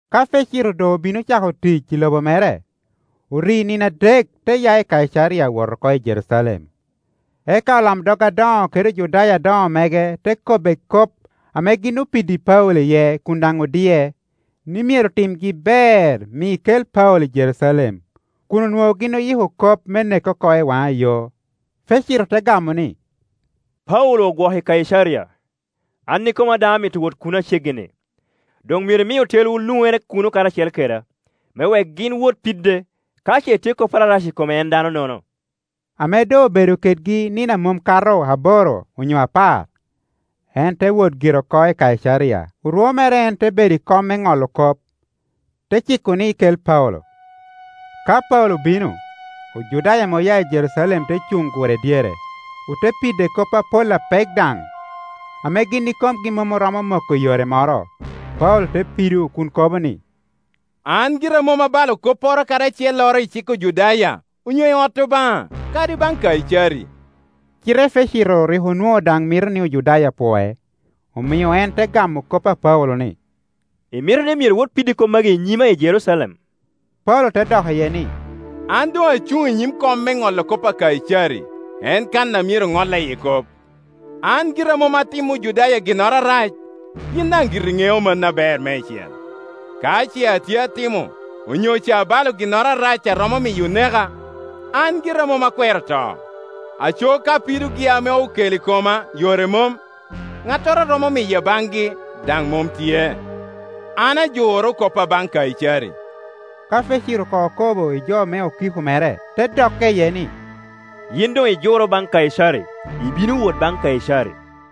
Ka Fesito doŋ obino ocako tic i lobo mere, ori nino adek te ya i Kaicaria wot oko i Jerucalem. Eka olamdog adoŋo kede Ojudaya adoŋo mege te kobbe kop ame gin opiddi Paulo iye kun daŋ odie, ni myero timgi ber mi kel Paulo i Jerucalem; kun onwoŋo gin oyiko kop me neke oko i waŋa yo. Fesito te gamo ni, “Paulo ogwoko i Kaicaria, an ikoma daŋ amito wot kuno aceggi-ni. Doŋ myero imi otelwu luŋere kuno karacel keda; me wek gin wot pide ka ce tye kopporo arac i kome en dano-nono.” Ame doŋ obedo kedgi nino a mom kato aboro onyo apar, en te wot gire oko i Kaicaria. Orwo mere en te bedo i kom me ŋolo kop, te ciko ni kel Paulo. Ka Paulo obino, Ojudaya ame oya i Jerucalem te cuŋ gure dyere, ote pide kop apol apek daŋ, ame gin ikomgi mom oromomoko i yore moro. Paulo te pido kun kobo ni, “An gira mom abalo kopporo kadi acelloro i cik Ojudaya, onyo i ot Obaŋa, kadi baŋ Kaicari.” Cite Fesito rik onwoŋo daŋ mito ni Ojudaya pwoc, omio en te gamo kop a Paulo ni, “Imito ni myero wot pidi kop magi i nyima i Jerucalem?” Paulo te dok iye ni, “An doŋ acuŋ i nyim kom me ŋolo kop a Kaicari, en kan a myero ŋolla iye kop. An gira mom atimmi Ojudaya ginnoro arac, yin daŋ giri iŋeo mano aber meicel. Ka ce atye atimo onyo ca abalo ginnoro arac a romo miyo oneka, an gira mom akwero to; aco ka pidogi ame okelo i koma yore mom, ŋattoro a romo miya baŋgi daŋ mom tye. An ajure koppa baŋ Kaicari.” Ka Fesito koŋ okobo i jo me okiko mere, te dokke iye ni, “Yin doŋ ijuro baŋ Kaicari, ibino wot baŋ Kaicari.”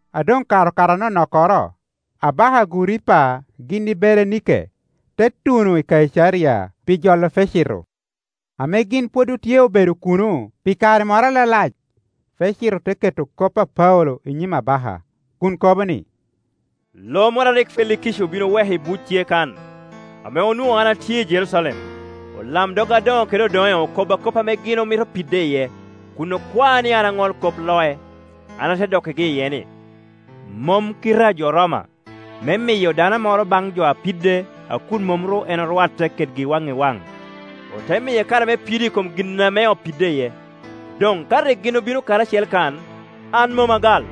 A doŋ kare okato anonokkoro, abaka Aguripa gin i Berenike te tuno i Kaicaria pi jolo Fesito. Ame gin pwod otye obedo kuno pi kare moro alalac, Fesito te keto kop a Paulo i nyim abaka, kun kobo ni, “Lo moro a rik Felikici bin oweko i buc tye kan. Ame onwoŋo an atye i Jerucalem, olamdog adoŋo kede odoŋe okobba kop ame gin omito pide iye, kun okwaa ni an aŋol kop loc. An ate dokkigi iye ni, mom kite a jo Roma me miyo dano moro baŋ jo apide a kun mom ru en orwatte kedgi waŋ i waŋ, ote miye kare me pido i kom gin ame opide iye. Doŋ ka rik gin obino karacel kan, an mom agal;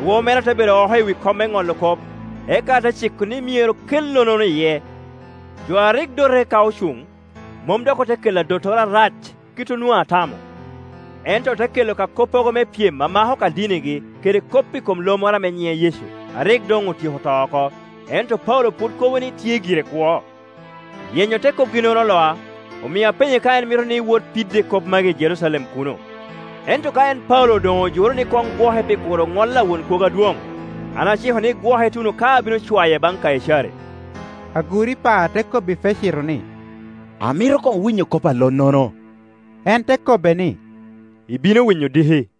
orwo mere ate bedo oko i wi kom me ŋolo kop, eka ate ciko ni myero kel lonnono iye. Jo a rik dote ka ocuŋ, mom dok ote kelo adottoro arac kit onwoŋo atamo; ento ote kelo ka koppogo me pyem a mako ka dinigi kede kop i kom lo moro ame nyiŋe Yecu, a rik doŋ otyeko to oko, ento Paulo pwod kobo ni tye gire kwo. Yenyo te kopgi-nono oloa, omio apenye ka en mito ni wot pide kop magi i Jerucalem kuno. Ento ka en Paulo doŋ ojuro ni koŋ gwoke pi kuro ŋol a Won Kwogo Adwoŋ, an aciko ni gwoke ituno ka abino cwaye baŋ Kaicari.” Aguripa te kobbi Fesito ni, “Amito koŋ winyo kop a lormono.” En te kobbe ni, “Ibino winyo diki.”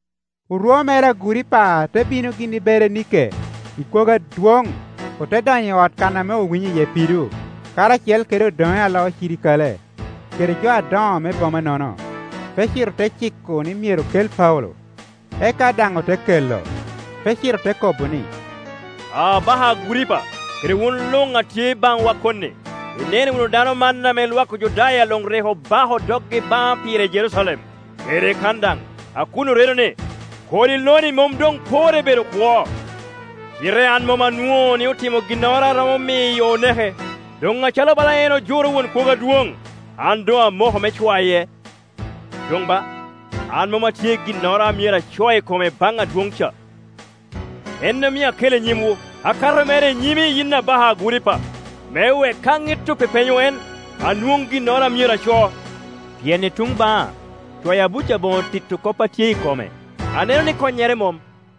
Orwo mere Aguripa te bino gin i Beranike i kwogo adwoŋ, ote donyo i ot kan ame owinyo iye pido, karacel kede odoŋe a loo crikale, kede jo adoŋo me boma-nono. Fesito te ciko ni myero kel Paulo, eka daŋ ote kelo. Fesito te kobo ni, “Abaka Aguripa, kede wun luŋ a tye baŋwa koni, ineno wunu dano man ame lwak Ojudaya luŋ rik obako doggi baŋa pire i Jerucalem, kede kan daŋ, a kun oredo ni, kodi lo-ni mom doŋ porre bedo kwo. Cite an mom anwoŋo ni otimo ginnoro a romo miyo oneke; doŋ acalo bala en ojuro Won Kwogo Adwoŋ, an doŋ amoko me cwaye. Doŋ ba, an mom atye i ginnoro a myero aco i kome baŋ adwoŋ ca. En omio akele i nyimwu, akato mere i nyimi yin abaka Aguripa, me wek ka ŋit opepenyo en, anwoŋ ginnogo a myero aco. Pien i tuŋ baŋa cwayo abuc aboŋo tito kop a tye i kome, aneno ni konnyere mom.”